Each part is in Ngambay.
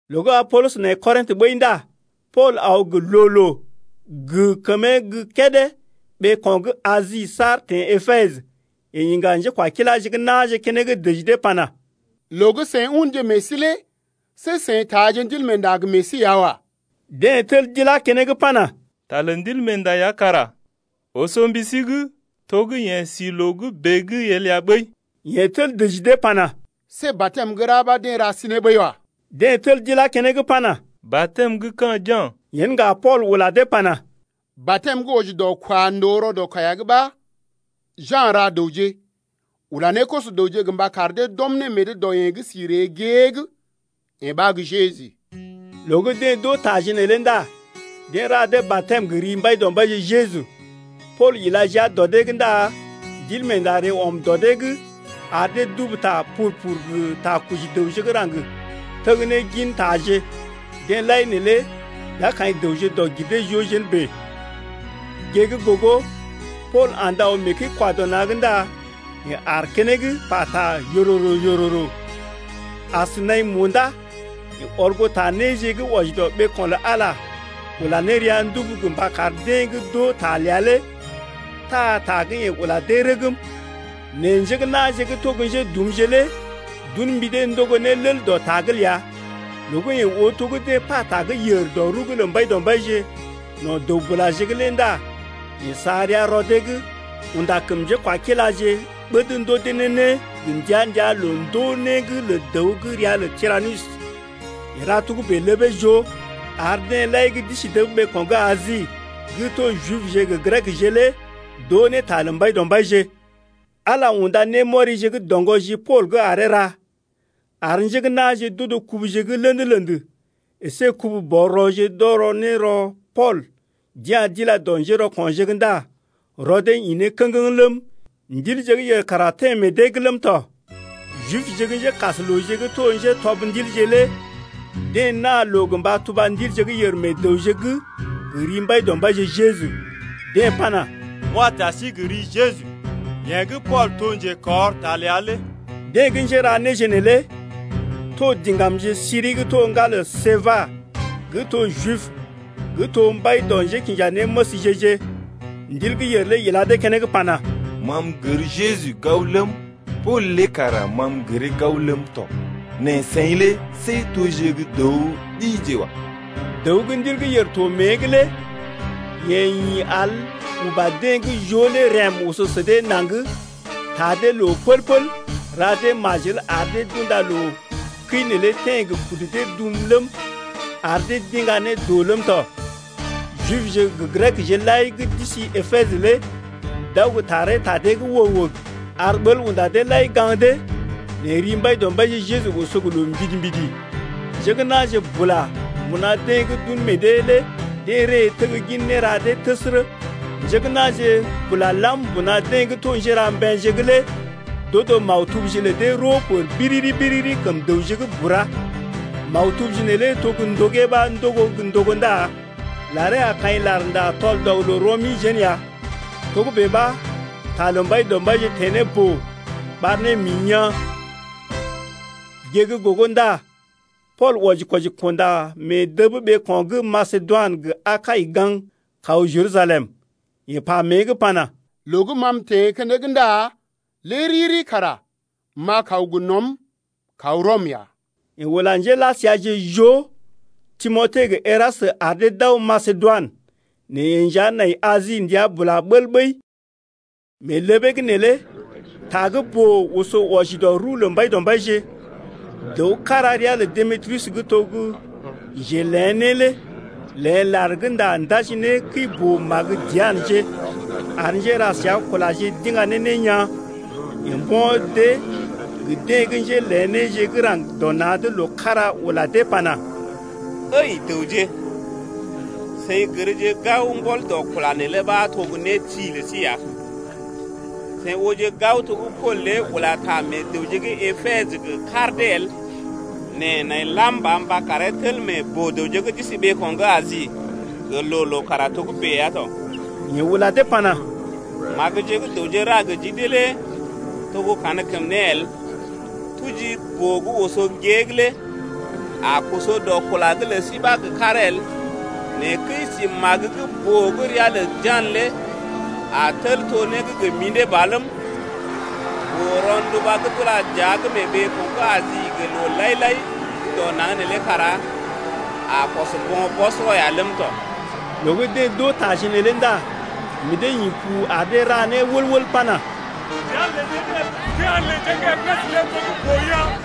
Loo gə́ Apolɔs nai Kɔrḭtə ɓəi ndá Pool aw gə loo-loo gə kəmee gə́ kédé ɓeeko̰ gə́ Asi saar teḛ Epesə. Yeḛ iŋga njékwakiláje gə́ na̰je keneŋ dəji dee pana: Loo gə́ seḭ unje meḛ sí lé see seḭ taaje Ndilmeenda gə meḛ sí ya wa. Deḛ tel d’ilá keneŋ pana: Ta lə Ndilmeenda ya kara oso mbi sí’g to gə́ yeḛ si loo gə́ bèe’g el ya ɓəi. Yeḛ tel dəji dee pana: See batɛm gə́ ra ɓa deḛ ra sí ne ɓəi wa. Deḛ tel d’ilá keneŋ pana: Batɛm gə́ ka̰ Ja̰. Yen ŋga Pool ula dee pana: Batɛm gə́ wɔji dɔ kwa ndòo rɔ dɔ kaiya’g ɓa Ja̰ ra dəwje ula ne koso-dəwje gə mba kar dee d’ɔm meḛ dee dɔ yeḛ gə́ si ree gée’g, yee ɓa gə́ Jeju. Loo gə́ deḛ d’oo taje neelé ndá deḛ ra dee batɛm gə ri Mbaidɔmbaije Jeju. Pool ila jia dɔ dee’g ndá Ndilmeenda ree ɔm dɔ dee’g ar dee d’ubu ta pur-pur gə takɔji dəwje gə́ raŋg teg ne gintaje. Deḛ lai neelé d’a kaḭ dəwje dɔg-gir-dee-joo jén bèe. Gée gə́ gogo Pool andə aw mee kəi-kwa-dɔ-na̰’g ndá yeḛ aar keneŋ pata yororo-yororo. As naḭ munda yeḛ ɔr goo ta néje gə́ wɔji dɔ ɓeeko̰ lə Ala ula ne rəa ndubu gə mba kar deḛ gə́ d’oo ta ləa lé taa ta gə́ yeḛ ula dee lé rəgm. Nɛ njé gə́ na̰je gə́ to gə́ njédumje lé d’un mbi dee ndogo ne lel dɔ ta’g ləa. Loo gə́ yeḛ oo to gə́ deḛ pata gə́ yèr dɔ rəw’g lə Mbaidɔmbaije no̰ dəw-bulaje’g lé ndá yeḛ sa rəa rɔ dee’g unda kəm njékwakiláje ɓəd ndoo dee ne né gə ndəa-ndəa loo-ndoo-né’g lə dəw gə́ ria lə Tiranus. Yeḛ ra togə́bè ləbee joo, ar deḛ lai gə́ d’isi dəb ɓeeko̰ gə́ Asi gə́ to Jibje gə Grekje lé d’oo ne ta lə Mbaidɔmbaije. Ala unda némɔrije gə́ doŋgɔ ji Pool’g aree ra, ar njé gə́ na̰je d’odo kubuje gə́ lḛd-lḛd əsé kubu-bɔr-rɔje d’ɔrɔ ne rɔ Pool d’ya̰ d’ila dɔ njérɔko̰je’g ndá rɔ dee ḭ ne kə̰geŋ ləm, ndilje gə́ yèr kara teḛ meḛ dee’g ləm tɔ. Jibje gə́ njékaslooje gə́ to njétɔb ndilje lé deḛ naa loo gə mba tuba ndilje gə́ yèr meḛ dəwje’g gə ri Mbaidɔmbaije Jeju, deḛ pana: M’wa ta sí gə ri Jeju, yeḛ gə́ Pool to njekɔr ta ləa lé. Deḛ gə́ njéra néje neelé to diŋgamje siri gə́ to ŋgalə Seba gə́ to Jib gə́ to mbai dɔ njékinjanéməsje-je. Ndil gə́ yèr lé ila dee keneŋ pana: Ma m’gər Jeju gao ləm, Pool lé kara ma m’gəree gao ləm tɔ, nɛ seḭ lé see toje gə́ dəw ɗije wa. Dəw gə́ ndil gə́ yèr to mée’g lé yeḛ ḭ al uba deḛ gə́ joo lé rəm oso sə dee naŋg taa dee loo pəl-pəl ra dee majel ar dee d’unda loo kəi neelé teḛ gə kudu dee dum ləm, ar dee d’iŋga ne doo ləm tɔ. Jibje gə Grekje lai gə́ d’isi Epesə lé d’aw gə taree ta dee’g wəg-wəg, ar ɓəl unda deḛ lai gaŋg dee, nɛ ri Mbaidɔmbaije Jeju oso gə loo mbidi-mbidi. Njé gə́ na̰je bula mbuna deḛ gə́ d’un meḛ dee lé deḛ ree teggin néra dee təsərə. Njé gə́ na̰je bula lam mbuna deḛ gə́ to njéra mbeḛje’g lé d’odo maktubje lə dee roo biriri-biriri kəm dəwje’g bura. Maktubje neelé to gə́ ndogee ɓa ndogo gə́ ndogo ndá laree a kaḭ larnda tɔl-dɔg-loo-rɔ-mi jén ya. Togə́bè ɓa ta lə Mbaidɔmbaije teḛ ne boo ɓar ne mḭ yaa̰. Gée gə́ gogo ndá Pool wɔji-kwɔji kunda mee dəb ɓeeko̰ gə́ Masedoinə gə Akai gaŋg kaw Jerusalem. Yeḛ pa mée’g pana: Loo gə́ ma m’teḛ keneŋ ndá lé riri kara m’a kaw gə nɔm kaw Rɔm ya. Yeḛ ula njéla səaje joo, Timote gə Erastə ar dee d’aw Masedoinə, nɛ yeḛ nja nai Asi ndəa bula bəl ɓəi. Mee ləbee’g neelé ta gə́ boo oso wɔji dɔ rəw lə Mbaidɔmbaije. Dəw kára ria lə Demetriyus gə́ to gə́ njelḛ̀ né lé léḛ lar gə́ nda ndaji ne kəi-boo-magə Dianəje ar njéra səa kulaje d’iŋga ne né yaa̰. Yeḛ mbo̰ dee gə deḛ gə́ njélḛ̀ néje gə́ raŋg dɔ na̰’d loo kára ula dee pana: Ǝi dəwje, seḭ gərje gao mbɔl dɔ kula neelé ɓa to gə́ né ti lə sí ya. Seḭ ooje gao to gə́ Pool lé ula ta meḛ dəwje gə́ Epesə gə kar dee el nɛ nai lam ba karee tel meḛ boo-dəwje gə́ d’isi ɓeeko̰ gə́ Asi gə loo-loo kara togə́bè ya tɔ. Yeḛ ula dee pana: Magəje gə́ dəwje ra gə ji dee lé to gə́ kankəm né el. Tuji gə́ boo gə́ oso gée lé a koso dɔ kula’g lə sí ba gə karee el, nɛ kəi-si magə gə́ boo gə́ ria lə Dianə lé a tel to né gə́ gə mḭdé ba ləm, boo-ronduba gə́ d’ula dəa’g mee ɓeeko̰ gə́ Asi gə loo lai-lai gə́ dɔ naŋg neelé kara a kɔs bo̰ bɔsɔrɔ ya ləm tɔ. Loo gə́ deḛ d’oo taje neelé ndá meḛ dee ḭ pu ar dee ra né wəl-wəl pana: Dianə lə njé gə́ Epesə lé to gə́ boo yaa̰!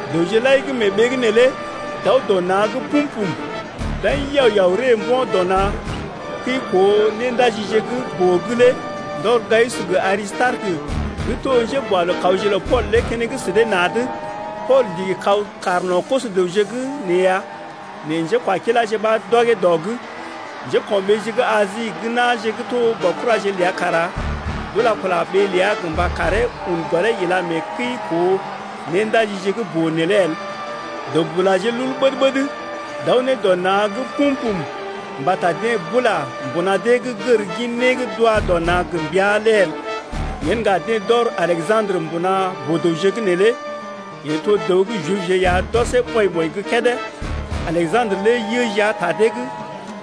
Dəwje lai gə́ mee ɓee’g neelé d’aw dɔ na̰’g pum-pum. D’aḭ yao-yao ree mbo̰ dɔ na̰ kəi-koo-néndajije gə́ boo’g lé ndɔr Gayus gə Arisitarəkə gə́ to njé gə́ Masedoinə gə́ to njéboalookawje lə Pool lé keneŋ sə dee na̰’d. Pool ndigi kaw kaar no̰ koso-dəwje’g nee ya nɛ njékwakiláje ɓa d’ɔgee dɔ’g. Njéko̰ɓeeje gə́ Asi gə́ na̰je gə́ to baokuraje ləa kara d’ula kula ɓee ləa gə mba karee un gɔlee ila mee kəi-koo-néndajije gə́ boo neelé el. Dəw-bulaje lul ɓəd-ɓəd d’aw ne dɔ na̰’g pum-pum mbata deḛ bula mbuna dee’g gər gin né gə́ d’wa dɔ na̰ gə mbəa lé el. Yen ŋga deḛ d’ɔr Aleja̰drə mbuna boo-dəwje’g neelé, yeḛ to dəw gə́ Jibje ya d’ɔsee ɓɔḭ-ɓɔḭ gə́ kédé. Aleja̰drə lé yə jia ta dee’g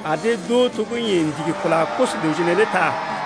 ar dee d’oo to gə́ yeḛ ndigi kula koso-dəwje neelé ta.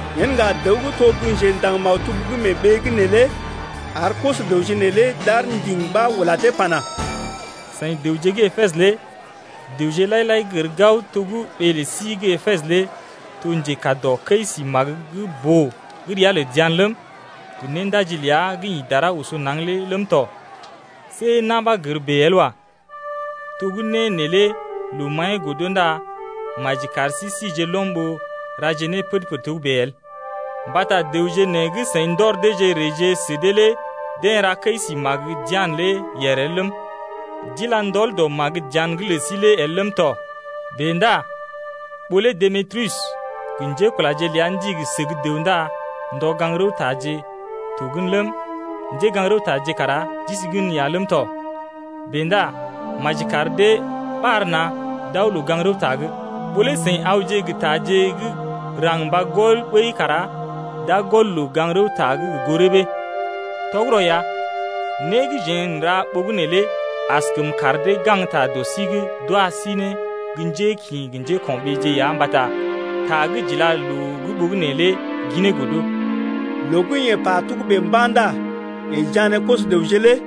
Yen ŋga dəw gə́ to gə́ njendaŋ-maktub gə́ mee ɓee’g neelé ar koso-dəwje neelé d’aar ndiŋ ɓa ula dee pana: Seḭ dəwje gə́ Epesə lé dəwje lai-lai gər gao to gə́ ɓee lə sí gə́ Epesə lé to njekaa dɔ kəi-si magə gə́ boo gə́ ria lə Dianə ləm, gə néndaji ləa gə́ ḭ dara oso naŋg lé ləm tɔ. See na̰ ɓa gər bèe el wa. To gə́ né neelé loo maḭyee godo ndá maji kar sí sije lɔm ɓó raje né pəd-pəd togə́bè el. Mbata dəwje nee gə́ seḭ ndɔr deeje reeje sə dee lé deḛ ra kəi-si Dianə lé yèr el ləm, d’ila ndɔl dɔ Dianə’g lə sí lé el ləm tɔ. Bèe ndá ɓó lé Demetriyus gə njékulaje ləa ndigi səg dəw ndá ndɔ gaŋg rəw-taje to gən ləm, njégaŋ-rəwtaje kara d’isi gən ya ləm tɔ, bèe ndá maji kar dee ɓar na̰ d’aw loo-gaŋg-rəwta’g. Ɓó lé seḭ awje gə taje gə́ raŋg mba gɔl ɓəi kara d’a gɔl loo-gaŋg-rəwta’g gə goo rəbee. Tɔgərɔ ya, né gə́ jeḛ n’ra ɓogənè lé askəm kar dee gaŋgta dɔ sí’g d’wa sí ne gə́ njékḭ gə njéko̰ɓeeje ya mbata ta gə́ j’ila loo’g ɓogənè lé ginee godo. Loo gə́ yeḛ pa togébè mba̰ nda yeḛ jané koso-dəwje tɔ.